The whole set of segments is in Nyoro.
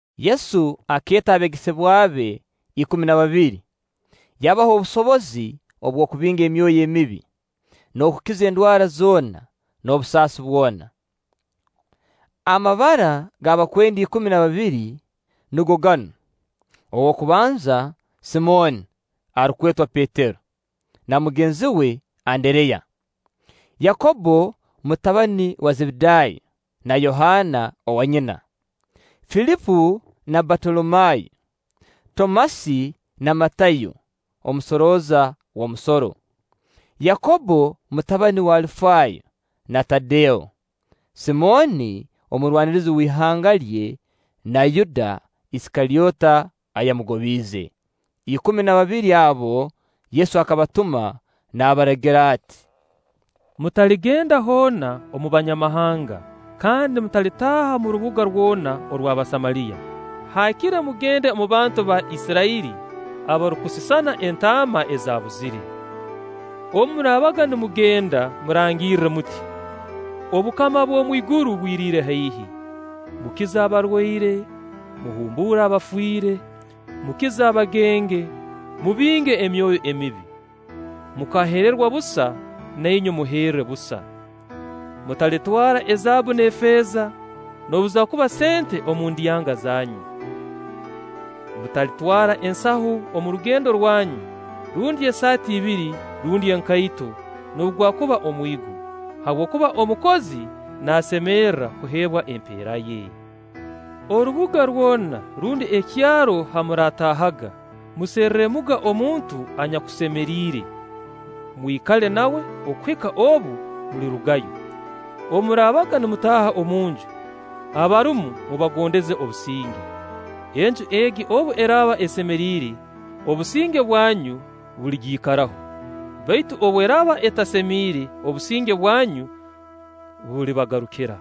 Yesu akeeta abeegesebwa be ikumi na babiri, yabaha obusobozi obw'okubinga emyoyo emibi, n'okukiza endwara zoona n'obusaasi bwona. Amabara g'abakwenda ikumi na babiri nugo ganu: ow'okubanza Simooni arukwetwa Petero, na mugenzi we Andereya; Yakobbo mutabani wa Zebedaayo na Yohaana owanyina; Filipo na Batolomayo; Tomasi na Matayo, omusorooza w'omusoro; Yakobbo mutabani w'Alifaayo, na Tadeo; Simooni omurwanirizi w'ihanga lye na Yuda Isikalyota ayamugobiize. Ikumi na babiri abo, Yesu akabatuma naabaragira ati: “Mutaligenda hoona mu Banyamahanga, kandi mutalitaaha omu rubuga rwona orw'Abasamaliya. Haakire mugende omu bantu ba Isirairi abarukusisana entaama ezaabuzire. Obu muraabaga nimugenda, murangirre muti: ‘Obukama bw'omu iguru bwiriire haihi.’ Mukize abarwaire, muhumbuule abafiire, mukize abagenge, mubinge emyoyo emibi. Mukaheerwa busa, na inywe muheere busa. Mutalitwara ezaabbu n'efeeza, noobu zaakuba sente omu ndyanga zanyu; mutalitwara ensaho omu rugendo rwanyu, rundi esaati ibiri, rundi enkaito, noobu gwakuba omwigo. Habwokuba omukozi naasemerra kuheebwa empeera ye. “Orubuga rwona rundi ekyaro ha muraataahaga, muserremuga omuntu anyakusemeriire, mwikale nawe okuhika obu mulirugayo. Obu muraabaga nimutaaha omunju, abarumu mubagondeze obusinge. Enju egi obu eraaba esemeriire, obusinge bwanyu buligiikaraho; baitu obu eraaba etasemeriire, obusinge bwanyu bulibagarukira.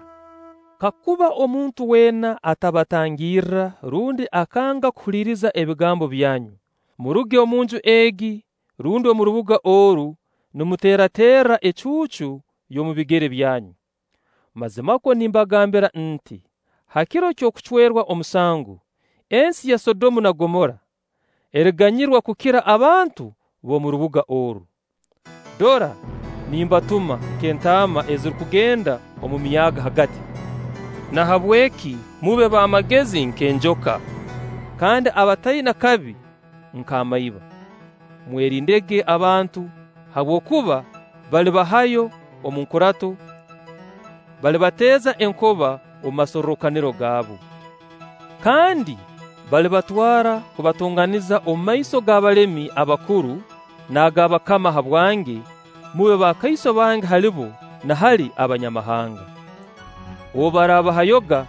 Kakuba omuntu weena atabatangirra rundi akanga kuhuliiriza ebigambo byanyu, muruge omunju egi rundi omu rubuga oru nimuteeraterra ecuucu y'omu bigere byanyu. Mazimakwo nimbagambira nti: Ha kiro ky'okucwerwa omusango, ensi ya Sodomu na Gomora eriganyirwa kukira abantu b'omu rubuga oru.” “Dora nimbatuma nk'entaama ezirukugenda omu myaaga hagati; nahabweki mube b'amagezi nk'enjoka, kandi abataina kabi nk'amaiba. “Mwerindege abantu; habwokuba balibahayo omu nkurato, balibateeza enkoba omu masorrokaniro gaabu, Kandi balibatwara kubatonganiza omu maiso g'abalemi abakuru n'ag'abakama habwange, mube bakaiso bange hali bo na hali Abanyamahanga. Obu baraabahayoga,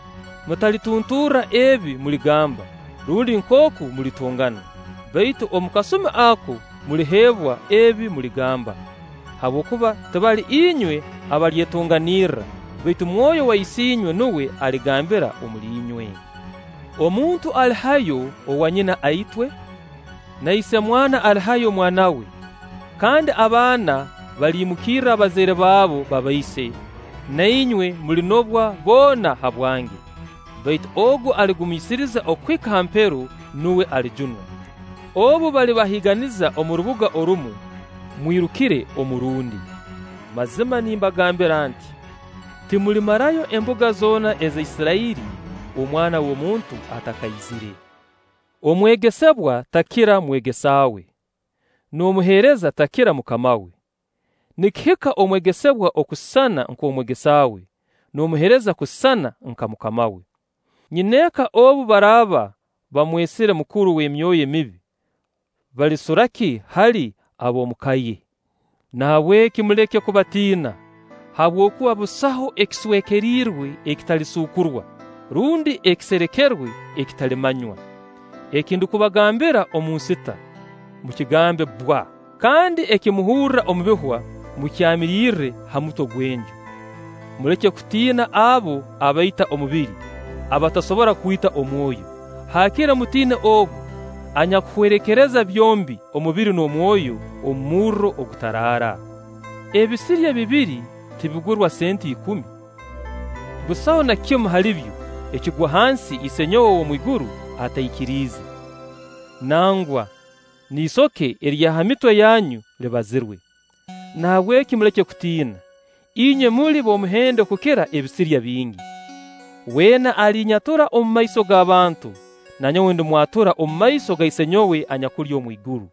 mutalitunturra ebi muligamba, rundi nkooku mulitongana; baitu omu kasumi ako muliheebwa ebi muligamba. Habwokuba tibali inywe abalyetonganirra, baitu Mwoyo wa Isiinywe nuwe aligambira omuli inywe. “Omuntu alihayo owanyina aitwe, na isemwana alihayo omwana we, kandi abaana baliimukirra abazaire baabo babaise; na inywe mulinobwa boona habwange. Baitu ogu aligumiisiriza okuhika ha mpero, nuwe alijunwa. Obu balibahiiganiza omu rubuga orumu, mwirukire omu rundi. Mazima nimbagambira nti: Timulimarayo embuga zoona eza Isirairi, Omwana w'omuntu atakaizire. “Omwegesebwa takira mwegesa we, n'omuheereza takira mukama we; nikihika omwegesebwa okusisana nk'omwegesa we, n'omuheereza kusisana nka mukama we. Nyineeka obu baraaba bamwesire mukuru w'emyoyo emibi, balisura ki hali ab'omu ka ye?” “Nahabweki muleke kubatiina, habwokuba busaho ekiswekeriirwe ekitalisuukurwa, rundi ekiserekerwe ekitalimanywa. Eki ndukubagambira omu nsita, mukigambe bbwa; kandi eki muhurra omu bihwa, mukyamirirre ha mutwe gw'enju. Muleke kutiina abo abaita omubiri, abatasobora kwita omwoyo; haakire mutiine Ogu anyakuhwerekereza byombi: omubiri n'omwoyo omu murro ogutaraara. Ebisirya bibiri tibigurwa sente ikumi? Busaho na kimu halibyo ekigwa hansi Isiinywe ow'omwiguru ataikiriize. Nangwa n'isoke erya ha mitwe yanyu libazirwe. Nahabweki muleke kutiina; inywe muli b'omuhendo kukira ebisirya bingi.” “Weena alinyatura omumaiso g'abantu, na nyowe ndimwatura omumaiso ga Isenyowe anyakuli omwiguru;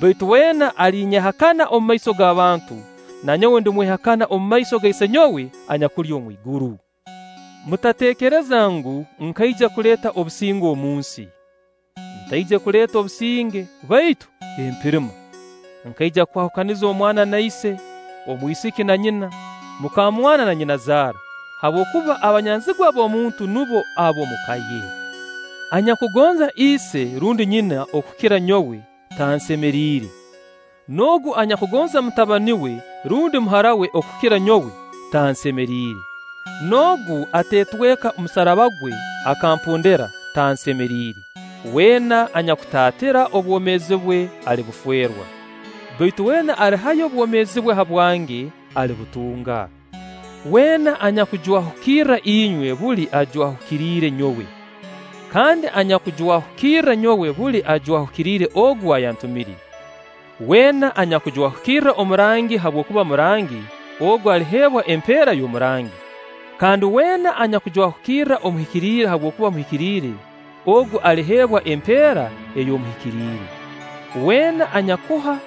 baitu weena alinyehakana omumaiso g'abantu, na nyowe ndimwehakana omu maiso ga Isenyowe anyakuli omwiguru. “Mutateekereza ngu, nkaija kuleeta obusinge omu nsi. Ntaije kuleeta obusinge, baitu empirima. Nkaija kwahukaniza omwana na ise, omwisiki na nyina, mukamwana na nyinazaara; habwokuba abanyanzigwa b'omuntu nubo ab'omu ka ye. Anyakugonza ise rundi nyina okukira nyowe, tansemeriire; n'ogu anyakugonza mutabani we rundi muhara we okukira nyowe, tansemeriire; n'ogu ateetweka musaraba gwe akampondera, tansemeriire. Weena anyakutaatira obwomeezi bwe, alibufeerwa; baitu weena alihayo obwomeezi bwe habwange, alibutunga.” “Weena anyakujwahukirra inywe, buli ajwahukiriire nyowe; kandi anyakujwahukirra nyowe, buli ajwahukiriire Ogu ayantumire. Weena anyakujwahukirra omurangi habwokuba murangi, ogu aliheebwa empeera y'omurangi; kandi weena anyakujwahukirra omuhikiriire habwokuba muhikiriire, ogu aliheebwa empeera y'omuhikiriire. Weena anyakuha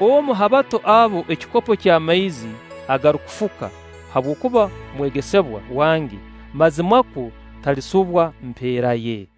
omu ha bato abo ekikopo ky'amaizi agarukufuka habwokuba mwegesebwa wange, mazimakwo talisubwa mpeera ye.”